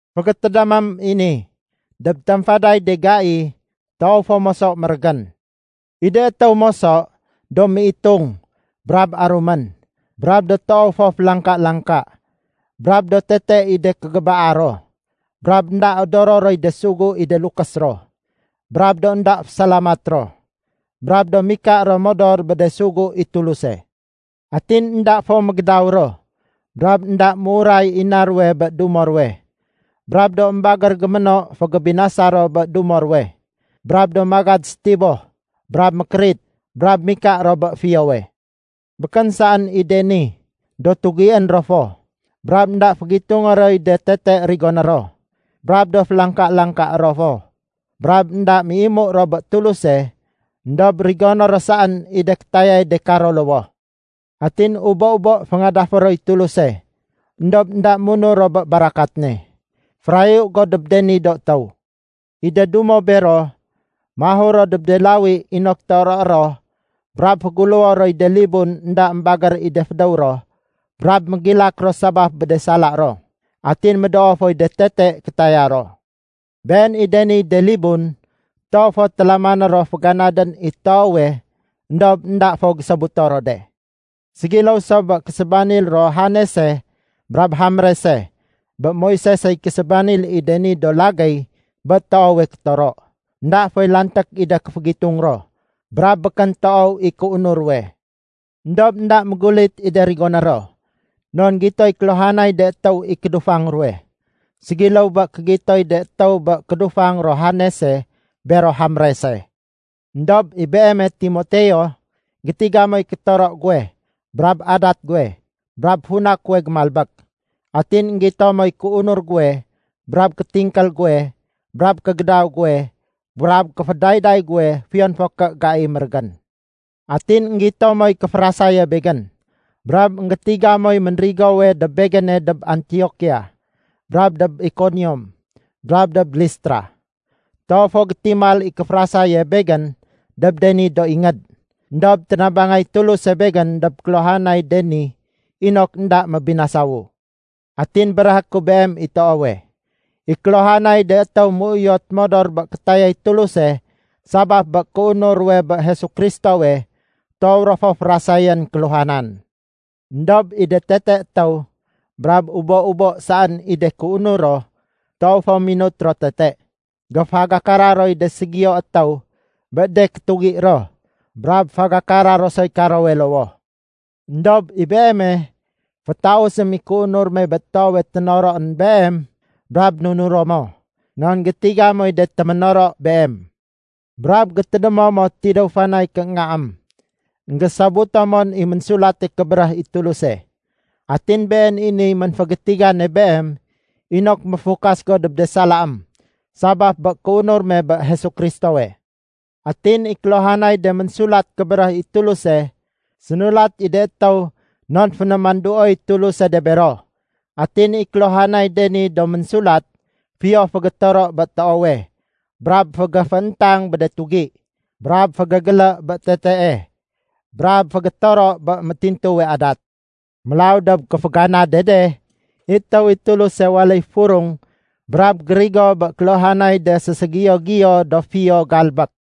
Fégétédémém i ni. Dob tamfaday de gai, toow fo moso mérégén. I de étéw moso, do méitung brab arumén, brab do toow fo félangka-langka, brab do tete i de kégébaa ro, brab énda odoro roy de sugu i de lukés ro, brab do énda fésalamat ro, brab do mika ro modor bé de sugu i Tuluse. Atin énda fo mégédaw ro, brab énda méuray i na ruwe bé dumo ruwe, brab do émbagér géméno fégébinasa ro bé dumo ruwe, brab do magad sétiboh brab mékérit, brab mika ro bé fiyowe. Békén saén i de ni, do tugién ro fo, brab énda fégitungé roy de tete rigoné ro, brab do félangka-langka ro fo, brab énda méimu ro bé Tuluse éndob rigoné ro saén i de kétayay de karo lowoh. Atin ubo-ubo féngadafé roy Tuluse, éndob énda munur ro bé barakat ne. Férayu go dob de ni do étéw. I de dumo bero, mahur ro dob de lawi inok toroé ro brab féguléwo roy de libun énda émbagér i de fédéw ro brab mégilak ro sabaf bé de sala ro, atin médoo foy de tete kétaya ro. Been i de niy de libun toow fo télamané ro féganadén i toowe éndob énda fo gésobuto ro de. Ségiléw so bé késébanil ro Janese brab Jambrese bé Moisesey késébanil i de ni do lagéy bé toowe kétoro. Enda foy lanték i de kéfégitung ro brab békén toow i kéunur ruwe. Endob énda mégulit i de rigoné ro, non gitoy kéluhanay de étéw i kédufang ruwe, ségiléw bé kégitoy de étéw bé kédufang ro Janese bero Jambrese. Endob i beeme Timoteo, gétiga moy kétoro guwe brab adat guwe brab funa kuwe gémalbék. Atin énggito moy kéunur guwe brab kétingkél guwe brab kégédaw guwe brab kéfédayday guwe fiyon fo ké gai mérégén. Atin énggito moy kéférasaye begén. Brab énggétiga moy ménrigowe dob begéne dob Antiokia, brab dob Ikonium, brab dob Listra. Toow fo gétimal i kéférasaye begén dob de ni do ingéd. Endob ténabangay Tuluse begén dob kéluhanay de ni inok énda mébinasawu. Atin béréhé ku beem i toowe, i kéluhanay de étéw méuyot modor bé kétayay Tuluse sabaf bé kéunur ruwe bé Jesu Kristowe, toow ro fo férasayén kéluhanan. Endob i de tete étéw brab ubo-ubo saén i de kéunur ro, toow fo minut ro tete. Géfagakara roy de ségiyo étéw bé de kétugié ro brab fagakara ro soy karowe lowoh. Endob i beeme, fétausém i kéunur me bé toowe ténoroén beem brab nunuro mo. Non gétiga moy de téménoro beem. Brab gétédémo mo tidéw fanay kééngaém, énggésobuto mon i Ménsulate Kébéréh i Tuluse. Atin been i niy ménfégétigane beem inok méfukas go dob de salaém sabaf bé kéunur me bé Jesu Kristowe. Atin i kéluhanay de Ménsulat Kébéréh i Tuluse, sénulat i de étéw non fénémanduoy Tuluse de bero. Atin i kéluhanay de ni do ménsulat fiyo fégétoro bé toowe, brab fégéfééntang bé de tugi, brab fégégélé bé tetee, brab fégétoro bé métintuwe adat. Mélaw dob kéféganade de, i étéw i Tuluse waléy furung brab gérigo bé kéluhanay de séségiyo-giyo do fiyo galbék.